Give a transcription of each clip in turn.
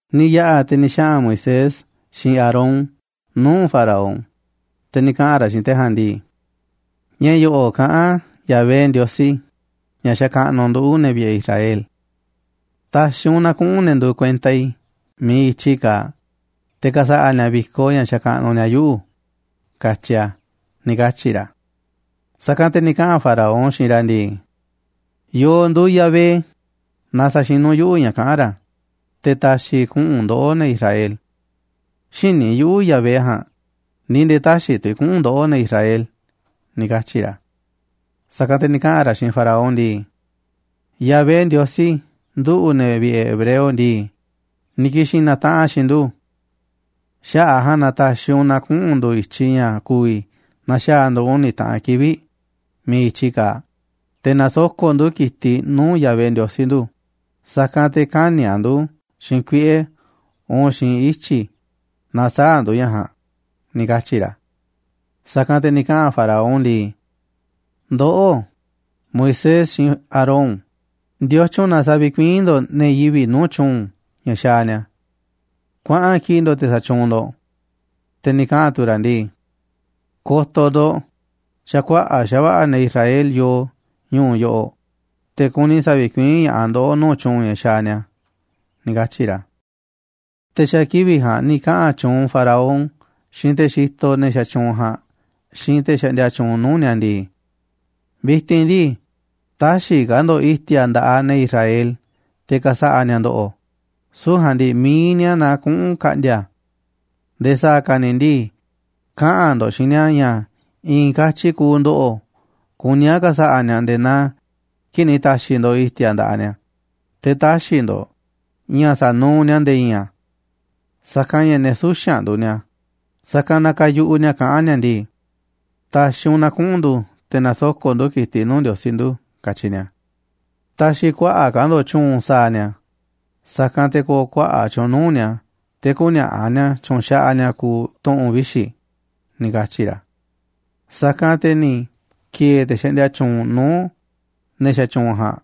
Ni̱ yaꞌa̱ te̱ ni̱ xaꞌa̱n Moisés xiinꞌ Aarón nuu̱ꞌ Faraón, te̱ ni̱ kaꞌa̱n ra̱ xiinꞌ te̱ ja̱a̱nꞌ ndii: ―Ña̱ yo̱ꞌo̱ꞌ kaꞌán Yahvé Ndiosí, ña̱ xakaꞌnuꞌ nduꞌu̱, ne̱ vi̱ꞌe̱ Israel: “Ta̱xi̱ u̱nꞌ na kuꞌu̱n ne̱ nduuꞌ kuenta i̱ miiꞌ i̱tyi kaaꞌ te̱ ka̱sa̱ꞌa̱ ni̱a̱ vi̱koꞌ ña̱ xakaꞌnuꞌ ni̱a̱ yuꞌu̱”, katyi̱ a̱ ―ni̱ katyi̱ ra̱. Sa̱kanꞌ te̱ ni̱ kaꞌa̱n Faraón xiinꞌ ra̱ ndii: ―¿Yo̱o̱ nduuꞌ Yahvé na sa̱xinu̱ yuꞌu̱ ña̱ kaꞌán ra̱, te̱ ta̱xi̱ i̱ kuꞌu̱n ndoꞌó, ne̱ Israel? Xïní yuꞌu̱ Yahvé ja̱a̱nꞌ, ni̱ nde̱e̱ tä̱xi̱ tu̱ i̱ kuꞌu̱n ndoꞌó, ne̱ Israel ―ni̱ katyi̱ ra̱. Sa̱kanꞌ te̱ ni̱ kaꞌa̱n ra̱ xiinꞌ Faraón ndii: ―Yahvé, Ndiosí nduꞌu̱, ne̱ vi̱ꞌe̱ hebreo ndii, ni̱ ki̱xi̱n na̱taꞌanꞌ a̱ xiinꞌ ndu̱. Xaꞌa̱ꞌ a̱ ja̱a̱nꞌ na ta̱xi̱ u̱nꞌ na kuꞌu̱n ndu̱ i̱tyiꞌ ña̱ ku̱vi̱ na̱xaa̱ ndu̱ uni̱ taꞌan kivi̱ꞌ miiꞌ i̱tyi kaaꞌ, te̱ na̱soko̱ꞌ ndu̱ ki̱tiꞌ nuu̱ꞌ Yahvé, Ndiosí nduꞌ, sa̱kanꞌ te̱ kä̱ni̱ a̱ ndu̱ xiinꞌ kuiꞌe̱ uun xiinꞌ ityi̱ naaꞌ sä̱a̱ ndu̱ ña̱ ja̱a̱nꞌ ―ni̱ katyi̱ ra̱. Sa̱kanꞌ te̱ ni̱ kaꞌa̱n Faraón ndii: ―Ndoꞌó, Moisés xiinꞌ Aarón, ¿ndiotyun na̱ savikuiín ndo̱ꞌ ne̱ yivi̱ꞌ nuu̱ꞌ tyu̱u̱n ña̱ xaaꞌ ni̱a̱? Kuaꞌan kiꞌi̱ꞌ ndo̱ꞌ te̱ sa̱tyuunꞌ ndo̱ꞌ. Te̱ ni̱ kaꞌa̱n tu̱ ra̱ ndii: ―Ko̱to̱ ndo̱ꞌ, xa̱ kuaꞌa̱ꞌ xa̱va̱ꞌa̱ ne̱ Israel yoo ñu̱u̱ yoꞌoꞌ, te̱ kuni sa̱vikuiín ña̱ꞌaꞌ ndoꞌó nuu̱ꞌ tyu̱u̱n ña̱ xaaꞌ ni̱a̱ ―ni̱ katyi̱ ra̱. Te̱ xa̱ kivi̱ꞌ ja̱a̱nꞌ ni̱ kaꞌa̱n tyuunꞌ Faraón xiinꞌ te̱ xitoꞌ ne̱ xatyuunꞌ ja̱a̱nꞌ xiinꞌ te̱ xaꞌndia tyuunꞌ nuu̱ꞌ ni̱a̱ ndii: ―Vi̱ti̱n ndii, tä̱xi̱ ka̱ ndo̱ꞌ i̱ti̱a̱ nda̱ꞌaꞌ ne̱ Israel te̱ ka̱sa̱ꞌa̱ ni̱a̱ ndo̱ꞌo̱, süu̱ꞌ ja̱a̱nꞌ ndii mi̱iꞌ ni̱a̱ na kuꞌu̱n ka̱ꞌndi̱a̱ a̱. Nde̱e̱ sa̱a̱ ka̱ ni̱ ndii, kaꞌa̱n ndo̱ꞌ xiinꞌ ni̱a̱ ña̱ i̱i̱n katyi kuuꞌ ndo̱ꞌo̱ kuní a̱ ka̱sa̱ꞌa̱ ni̱a̱ nde̱e̱ naa kii̱ꞌ ni̱ ta̱xi̱ ndo̱ꞌ i̱ti̱a̱ nda̱ꞌaꞌ ni̱a̱, te̱ tä̱xi̱ ndo̱ꞌ ña̱ sa̱nuuꞌ ni̱a̱ nde̱e̱ i̱i̱n a̱. Sa̱kanꞌ ña̱ ne̱ suxa̱nꞌ nduuꞌ ni̱a̱, sa̱kanꞌ na kayuꞌuꞌ ni̱a̱ kaꞌán ni̱a̱ ndii: “Ta̱xi̱ u̱nꞌ na kuꞌu̱n ndu̱ te̱ na̱soko̱ꞌ ndu̱ ki̱tiꞌ nuu̱ꞌ Ndiosí nduꞌ”, katyi ni̱a̱. Ta̱xi̱ kuaꞌa̱ꞌ ka̱ ndo̱ꞌ tyu̱u̱n sa̱a̱ ni̱a̱, sa̱kanꞌ te̱ ko̱o̱ kuaꞌa̱ꞌ tyu̱u̱n nuu̱ꞌ ni̱a̱ te̱ kü̱ni̱a̱ꞌa̱ ni̱a̱ tyu̱nxaꞌaꞌ ni̱a̱ kuuꞌ tu̱ꞌu̱n vixi̱ ―ni̱ katyi̱ ra̱. Sa̱kanꞌ te̱ ni̱ ki̱e̱e̱ te̱ xaꞌndia tyuunꞌ nuu̱ꞌ ne̱ xatyuunꞌ ja̱a̱nꞌ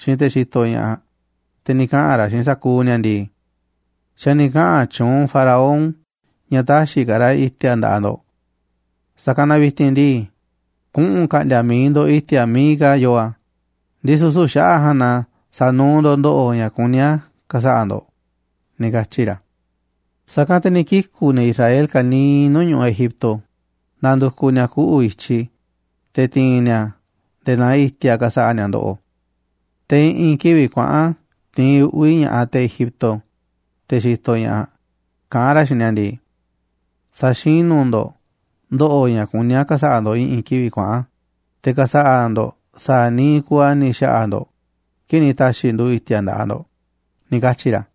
xiinꞌ te̱ xitoꞌ ña̱ꞌaꞌ, te̱ ni̱ kaꞌa̱n ra̱ xiinꞌ sa̱kuuꞌ ni̱a̱ ndii: ―Xa̱ ni̱ kaꞌa̱n tyuunꞌ Faraón ña̱ tä̱xi̱ ka̱ ra̱ i̱ti̱a̱ nda̱ꞌaꞌ ndo̱ꞌ. Sa̱kanꞌ na vi̱ti̱n ndii, kuꞌu̱n ka̱ꞌndi̱a̱ mi̱iꞌ ndo̱ꞌ i̱ti̱a̱ miiꞌ ka̱ yoo a̱, ndisu̱ süu̱ꞌ xaꞌa̱ꞌ ja̱a̱nꞌ na sa̱nuuꞌ ndo̱ꞌ ndo̱ꞌo̱ ña̱ kuní a̱ ka̱sa̱ꞌa̱ ndo̱ꞌ ―ni̱ katyi̱ ra̱. Sa̱kanꞌ te̱ ni̱ kiku̱ ne̱ Israel ka̱niiꞌ nuu̱ꞌ ñu̱ꞌuꞌ Egipto nandukuꞌ ni̱a̱ kuꞌu̱ i̱tyi, te̱ ti̱i̱n ni̱a̱ nde̱e̱ naa i̱ti̱a̱ ka̱sa̱ꞌa̱ ni̱a̱ ndo̱ꞌo̱. Te̱ i̱ꞌi̱n kivi̱ꞌ kuaꞌa̱n tiinꞌ uꞌvi̱ ña̱ꞌaꞌ te̱ Egipto, te̱ xitoꞌ ña̱ꞌaꞌ, kaꞌán ra̱ xiinꞌ ni̱a̱ ndii: ―Sa̱xinu̱ ndo̱ꞌ ndo̱ꞌo̱ ña̱ kuní a̱ ka̱sa̱ꞌa̱ ndo̱ꞌ i̱ꞌi̱n kivi̱ꞌ kuaꞌa̱n, te̱ ka̱sa̱ꞌa̱ ndo̱ꞌ sa̱a̱ niiꞌ kuuꞌ a̱ ni̱ xa̱ꞌa̱ ndo̱ꞌ kii̱ꞌ ni̱ ta̱xi̱ ndu̱ i̱ti̱a̱ nda̱ꞌaꞌ ndo̱ꞌ ―ni̱ katyi̱ ra̱.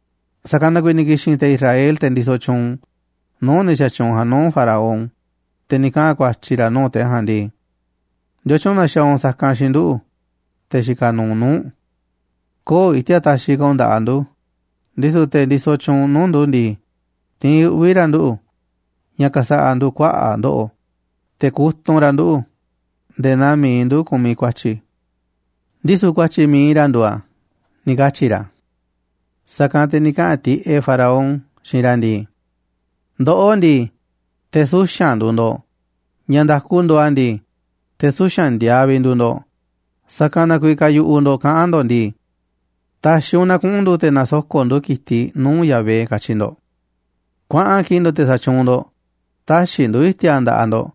Sa̱kanꞌ na kuiiꞌ ni̱ ki̱xi̱n te̱ Israel, te̱ ndisoꞌ tyuunꞌ nuu̱ꞌ ne̱ xatyuunꞌ ja̱a̱nꞌ, nuu̱ꞌ Faraón, te̱ ni̱ kaꞌa̱n ku̱a̱tyi̱ ra̱ nuu̱ꞌ te̱ ja̱a̱nꞌ ndii: ―¿Ndiotyun na xaaꞌ u̱nꞌ sa̱kanꞌ xiinꞌ nduꞌu̱, te̱ xikaꞌ nuuꞌ nuu̱ꞌ u̱nꞌ? Köo̱ꞌ i̱ti̱a̱ taxiꞌ ka̱ u̱nꞌ nda̱ꞌaꞌ ndu̱, ndisu̱ te̱ ndisoꞌ tyuunꞌ nuu̱ꞌ ndu̱ ndii, tiinꞌ uꞌvi̱ ra̱ nduꞌu̱ ña̱ ka̱sa̱ꞌa̱ ndu̱ kuaꞌa̱ꞌ ndo̱ꞌo̱, te̱ kutunꞌ ra̱ nduꞌu̱ nde̱e̱ naaꞌ mi̱iꞌ ndu̱ kumiꞌ ku̱a̱tyi̱, ndisu̱ ku̱a̱tyi̱ mi̱iꞌ ra̱ nduuꞌ a̱ ―ni̱ katyi̱ ra̱. Sa̱kanꞌ te̱ ni̱ kaꞌa̱n tiꞌeꞌ Faraón xiinꞌ ra̱ ndii: ―¡Ndoꞌó ndii, te̱ suxa̱nꞌ nduuꞌ ndo̱ꞌ! ¡Ña̱ nda̱ku nduuꞌ a̱ ndii, te̱ suxa̱nꞌ ndiaaꞌ vi̱ꞌ nduuꞌ ndo̱ꞌ! Sa̱kanꞌ na kuiiꞌ kayuꞌuꞌ ndo̱ꞌ kaꞌán ndo̱ꞌ ndii: “Ta̱xi̱ u̱nꞌ na kuꞌu̱n ndu̱ te̱ na̱soko̱ꞌ ndu̱ ki̱tiꞌ nuu̱ꞌ Yahvé”, katyi̱ ndo̱ꞌ. Kuaꞌa̱n kiꞌi̱ꞌ ndo̱ꞌ, te̱ sa̱tyuunꞌ ndo̱ꞌ, tä̱xi̱ ndu̱ i̱ti̱a̱ nda̱ꞌaꞌ ndo̱ꞌ,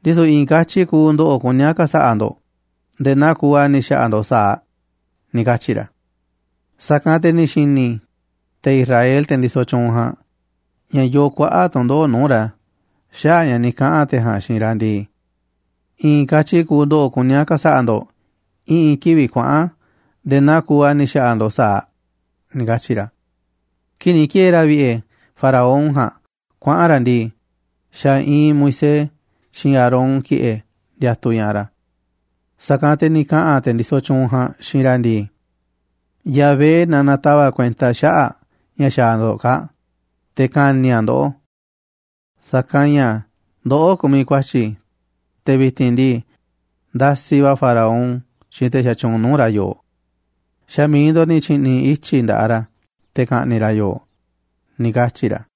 ndisu̱ i̱i̱n katyi kuuꞌ ndo̱ꞌo̱ kuní a̱ ka̱sa̱ꞌa̱ ndo̱ꞌ nde̱e̱ naa kuuꞌ a̱ ni̱ xa̱ꞌa̱ ndo̱ꞌ sa̱aꞌ ―ni̱ katyi̱ ra̱. Sa̱kanꞌ te̱ ni̱ xi̱ni̱ te̱ Israel, te̱ ndisoꞌ tyuunꞌ ja̱a̱nꞌ, ña̱ yoo kuaꞌa̱ꞌ tu̱ndoꞌo̱ꞌ nuu̱ꞌ ra̱ xaꞌa̱ꞌ ña̱ ni̱ kaꞌa̱n te̱ ja̱a̱nꞌ xiinꞌ ra̱ ndii: “I̱i̱n katyi kuuꞌ ndo̱ꞌo̱ kuní a̱ ka̱sa̱ꞌa̱ ndo̱ꞌ i̱ꞌi̱n kivi̱ꞌ kuaꞌa̱n nde̱e̱ naa kuuꞌ a̱ ni̱ xa̱ꞌa̱ ndo̱ꞌ sa̱aꞌ”, ni̱ katyi̱ ra̱. Kii̱ꞌ ni̱ ki̱e̱e̱ ra̱ vi̱ꞌe̱ Faraón ja̱a̱nꞌ kuaꞌa̱n ra̱ ndii, xa̱ iinꞌ Moisés xiinꞌ Aarón ki̱ꞌe̱ ndiatuꞌ ña̱ꞌaꞌ ra̱. Sa̱kanꞌ te̱ ni̱ kaꞌa̱n te̱ ndisoꞌ tyuunꞌ ja̱a̱nꞌ xiinꞌ ra̱ ndii: ―Yahvé na na̱tava̱ꞌ kuenta xaꞌa̱ꞌ ña̱ xaaꞌ ndo̱ꞌ kaa̱ꞌ, te̱ ka̱ni̱ a̱ ndoꞌó. Sa̱kanꞌ ña̱ ndoꞌó kumiꞌ ku̱a̱tyi̱, te̱ vi̱ti̱n ndii, ndasiꞌ va̱ Faraón xiinꞌ te̱ xatyuunꞌ nuu̱ꞌ ra̱ yooꞌ. Xa̱ mi̱iꞌ ndo̱ꞌ ni̱ tyi̱ꞌni̱ ityi̱ nda̱ꞌaꞌ ra̱ te̱ ka̱ꞌni̱ꞌ ra̱ yooꞌ ―ni̱ katyi̱ ra̱.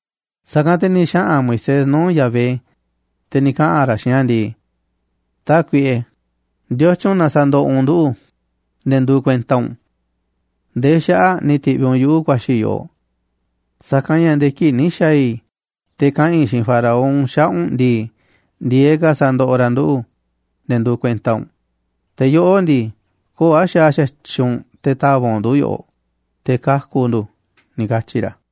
Sa̱kanꞌ te̱ ni̱ xaꞌa̱n Moisés nuu̱ꞌ Yahvé, te̱ ni̱ kaꞌa̱n ra̱ xiinꞌ a̱ ndii: ―Tákuiꞌe, ¿ndiotyun na sandoꞌoꞌ u̱nꞌ nduꞌu̱, ne̱ nduuꞌ kuenta u̱nꞌ? ¿Ndee xaꞌa̱ꞌ ni̱ ti̱ꞌviꞌ u̱nꞌ yuꞌu̱ ku̱a̱xi̱ i̱ yoꞌoꞌ? Sa̱kanꞌ ña̱ nde̱e̱ kii̱ꞌ ni̱ xa̱a̱ i̱ te̱ kaꞌa̱n i̱ xiinꞌ Faraón xaꞌa̱ꞌ u̱nꞌ ndii, ndi̱e̱eꞌ ka̱ sandoꞌoꞌ ra̱ nduꞌu̱, ne̱ nduuꞌ kuenta u̱nꞌ. Te̱ yoꞌó ndii, köo̱ꞌ a̱ xaaꞌ xa̱tyiꞌ u̱nꞌ te̱ ta̱va̱ꞌ u̱nꞌ ndu̱ yoꞌoꞌ, te̱ kaku̱ ndu̱ ―ni̱ katyi̱ ra̱.